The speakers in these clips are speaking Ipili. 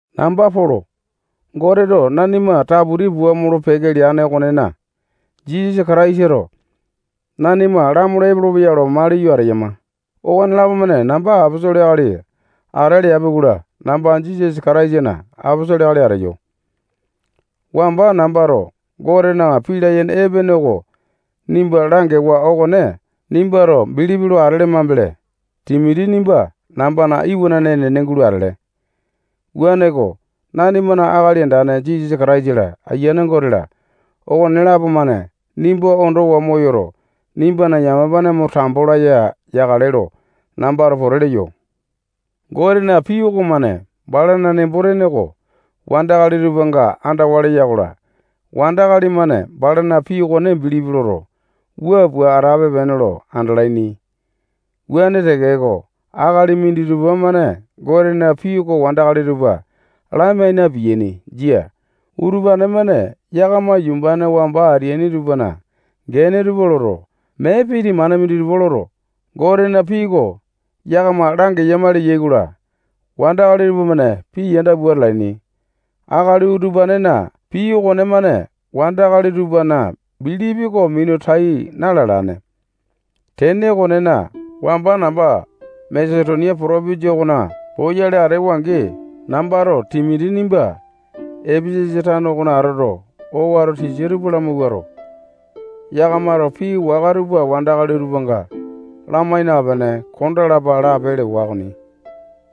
Namba Polo. Goteto nanima taputi pua molo-peke leane okonena, Jisasa Kataisato nanima lamolo epolopeya lo maliyo ateyama. Okonelapo-mane namba aposolo akali ata leapi-kola, namba Jisasa Kataisana aposolo akali ateyo. Wamba nambato Gotena pii layene epene oko nimba langewa okone nimbato bilipi lo atele mambele, Timoti nimba nambana iwanane enene gulo atele. Wuaneko, nanimana Akali Andane Jisasa Kataisa-la, Ayiane Gote-la, okonelapo-mane nimba ondowa moyoto, nimbana yamapane mo tambo laya yakale lo nambato pote leyo. Gotena pii okomane balana nembo-tene oko wandakali tupanga andawa leya-kola, wandakali-mane balana pii okone bilipi loto, wua pua atape-pene lo andalaini. Wuane tekeko, akali minditupa-mane Gotena pii oko wandakali tupa lamai na-piyaini. Jia. Utupane-mane yakama yumbane wamba ateaini tupana gene tupa loto, mee pii temane minditupa loto, Gotena pii oko yakama langeyama leyai-kola, wandakali tupamane pii yanda pua atalaini. Akali utupanena pii okonemane wandakali tupana bilipi oko minu tai na-lalane. Tene okonena, wamba namba Masetonia potopinjia okona poyale atewa-angi, nambato Timoti nimbato Epesasa tano okona atoto, owato tisa tupa lamawuato, yakamato pii waka tupa wandakali tupanga lamai napene kondalapa lape lewa okoni.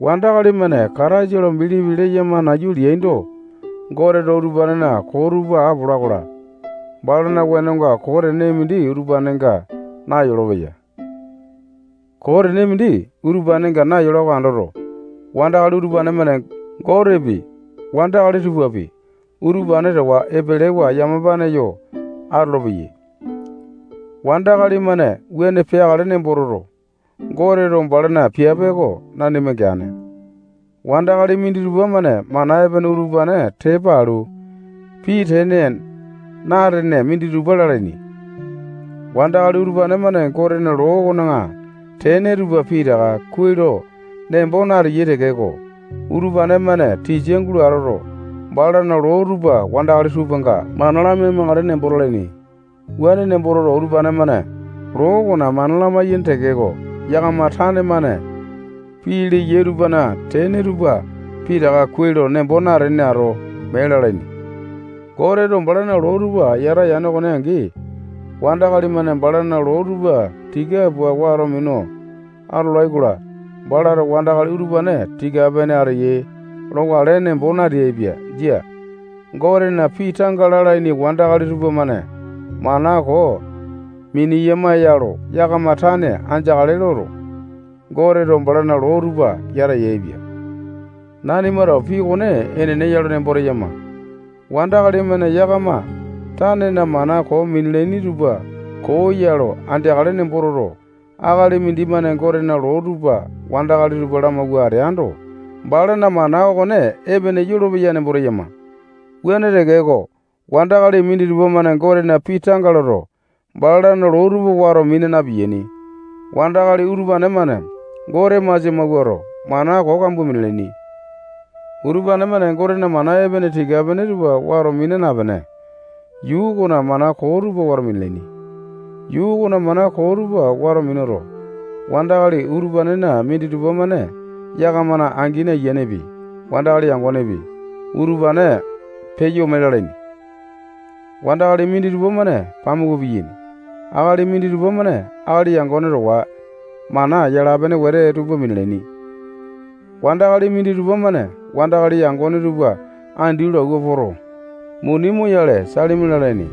Wandakali-mane Kataisa lo bilipi leyama nayu leaindo, Goteto utupanena koo tupa apola-kola, balana wenonga koo tene mindi utupanenga nayolopeya. Koo tene mindi utupanenga nayola oko andoto, wandakali utupane-mane Gotepi, wandakali tupapi, utupane towa epelewa yamapane yo atolopeyai. Wandakali-mane wuane peakale nembo toto, Goteto balana piape oko nanima geane. Wandakali minditupa-mane mana epene utupane tepa alu, pii tene na-atene minditupa lalaini. Wandakali utupane-mane Gotena loo okona tene tupa pitaka kuai lo nembo nateyai tekeko, utupane-mane tisa gulo atoto, balana loo tupa wandakali tupanga mana lamai-makale nembo talaini. Wuane nembo toto, utupane-mane loo okona mana lamai-yaini tekeko, yakama tane-mane pii leyai tupana tene tupa pitaka kuai lo nembo natene ato, mee lalaini. Goteto balana loo tupa yata yane okone angi, wandakali-mane balana loo tupa tika pua wato minu atolai-kola, balato wandakali utupane tika-pene ateyai lokale nembo nateaipia. Jia. Gotena pii tanga lalaini wandakali tupamane mana koo miniyama ya lo yakama tane andeakale loto, Goteto balana loo tupa yata yaepia. Nanimato pii okone enene ya lo nembo teyama. Wandakali-mane yakama tanena mana koo minalaini tupa koo ya lo andeakale nembo toto, akali mindimane Gotena loo tupa wandakali tupa lamawua ateando, balana mana okone epene yolopeya nembo teyama. Wuane tekeko, wandakali minditupa-mane Gotena pii tanga loto, balana loo tupa wato mina na-piyaini. Wandakali utupane-mane Gote masia mawuato, mana koo kambua minalaini. Utupane-mane Gotena mana epene tika-pene tupa wato mina napene, yuu okona mana koo tupa wato minalaini. Yuu okona mana koo tupa wato minuto, wandakali utupanena minditupa-mane yakamana angini ayianepi, wandakali yangonepi, utupane peyo ome lalaini. Wandakali minditupa-mane pamuku piyaini. Akali minditupa-mane akali yangone towa mana yala-pene wete tupa minalaini. Wandakali minditupa-mane wandakali yangone tupa andi lo awua poto, muni moyale, salimi lalaini.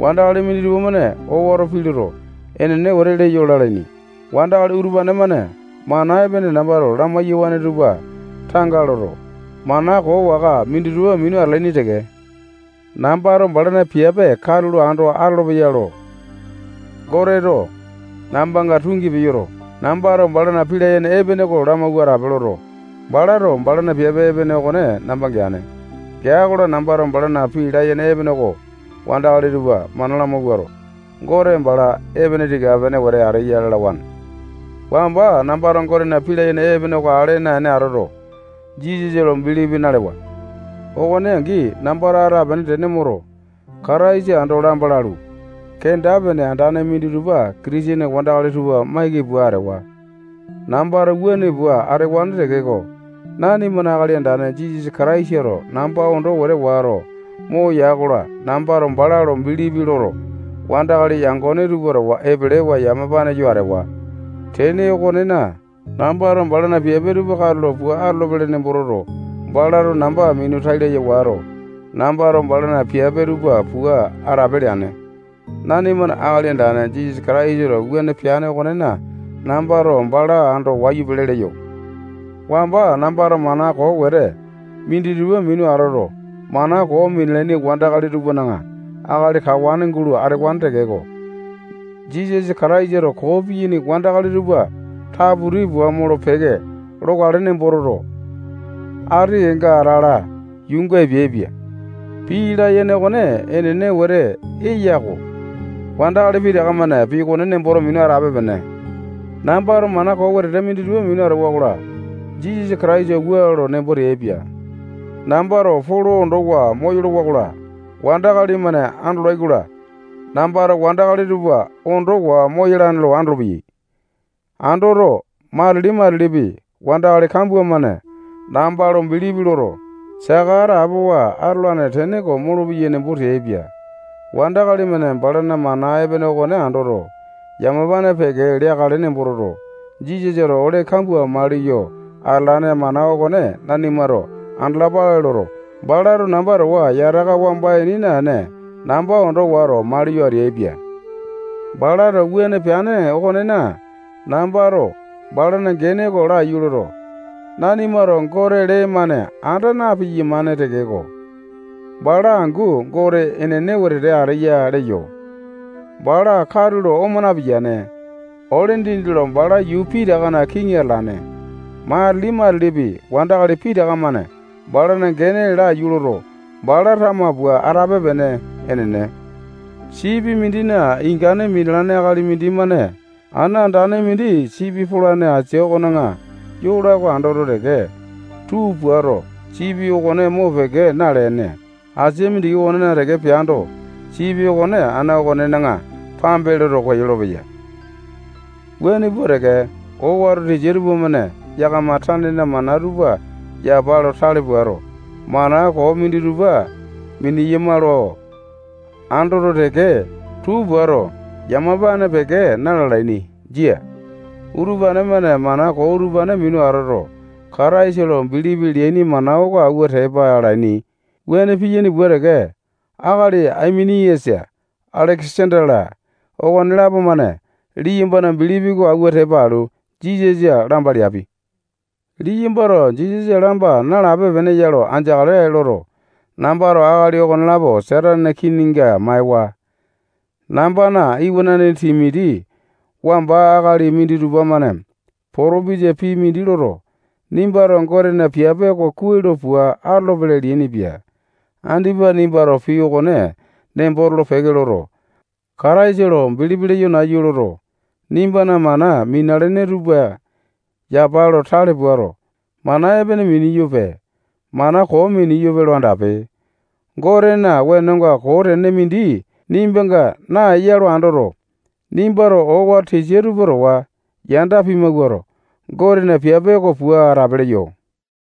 Wandakali minditupa-mane owato pii loto, enene wetete leyo lalaini. Wandakali utupane-mane mana epene nambato lamai-yawane tupa tanga loto, mana koo waka minditupa minu atalaini teke. Nambato balana piape katulo ando atolopeya lo Goteto nambanga tungi peyoto, nambato balana pii layene epene oko lamawua atape loto, balato balana piape okone namba geane. Geai-kola, nambato balana pii layene epene oko wandakali tupa mana lamawuato, Gote bala epene tika-pene wete ateya lalawane. Wamba nambato Gotena pii layene epene oko ale naene atoto, Jisasa lo bilipi nalewa. Okone angi, nambato atapiane tene moto, Kataisa ando lamba lalu, kenda-pene andane minditupa Kitisene wandakali tupa maiki pua atewa. Nambato wuane pua atewane tekeko, nanimana Akali Andane Jisasa Kataisato namba ondo wete wato moya-kola, nambato bala lo bilipi loto, wandakali yangone tupa towa epelewa yamapane yo atewa. Tene okonena, nambato balana piape tupa katulo pua atolopele nembo toto, balato namba minu tai laya wato, nambato balana piape tupa pua atape leane. Nanimana Akali Andane Jisasa Kataisato wuane peane okonena, nambato bala ando wayu pele leyo. Wamba nambato mana koo wete minditupa minu atoto, mana koo minalaini wandakali tupana akali kawane gulo atewane tekeko, Jisasa Kataisato koo piyaini wandakali tupa taputi pua molo-peke lokale nembo toto, ati kenga atala yuunga epeaipia. Pii layene okone enene wete eya-ko. Wandakali pitaka-mane pii okone nemboto minu atape-pene. Nambato mana koo wetete minditupa minu atewa-kola, Jisasa Kataisato wua lo nembo teaipia: Nambato Polo ondowa moyolowa-kola, wandakali-mane andolai-kola, nambato wandakali tupa ondowa moyalane lo andolopeyai. Andoto, matili-matilipi, wandakali kambua-mane namba lo bilipi loto, saka atapowa atolane tene oko molopeyai nembo teaipia. Wandakali-mane balana mana epene okone andoto, yamapane peke leakale nembo toto, Jisasato ole kambua maliyo atalane mana okone nanimato andalapale loto, balato namba towa yataka wamba ini naene, namba ondo wato, maliyo ateaipia. Balato wuane peane okonena, nambato balana gene oko laiyu loto, nanimato Gote lee-mane anda na-piyamane tekeko, bala angu Gote enene wetete ateya leyo. Bala katulo oma napiyane. Ole dindi lo bala yuu pitakana kiŋi atalane. Matili-matilipi, wandakali pitaka-mane balana gene oko laiyu loto, bala tama pua atape-pene. Enene. Sipi mindina ingane minalane akali mindimane ana andane mindi sipi polane asia okona yola oko andoto teke, tuu puato, sipi okone mopeke nalene, asia mindiki okonena teke peando, sipi okone ana okonena pambe loto, koyolo-peya. Wuane pua teke, owato tisa tupamane yakama tanena mana tupa yapa lo tale puato, mana koo minditupa mineyama lo andoto teke, tuu puato, yamapane peke na-lalaini. Jia. Utupane-mane mana koo utupane minu atoto, Kataisa lo bilipi leaini mana oko awua tepa alaini. Wuane piyane pua teke, akali Aimeniasa, Alekesanda-la, okonelapo-mane liyambana bilipi oko awua tepa alu, Jisasa lamba leapi. Liyambato Jisasa lamba nalape-pene ya lo andeakale loto, nambato akali okonelapo Satanena kininga maewa. Nambana iwanane Timoti, wamba akali minditupa-mane potopesa pii mindi loto, nimbato Gotena piape oko kuai lo pua atolopele leainipia. Andipa nimbato pii okone nembo tolo-peke loto, Kataisa lo bilipi leyo nayu loto, nimbana mana minalene tupa yapa lo tale puato, mana epene miniyope, mana koo miniyope lo andape. Gotena wenonga koo tene mindi nimbanga naeya lo andoto, nimbato owato tisa tupa towa yanda pimawuato, Gotena piape oko pua atape leyo.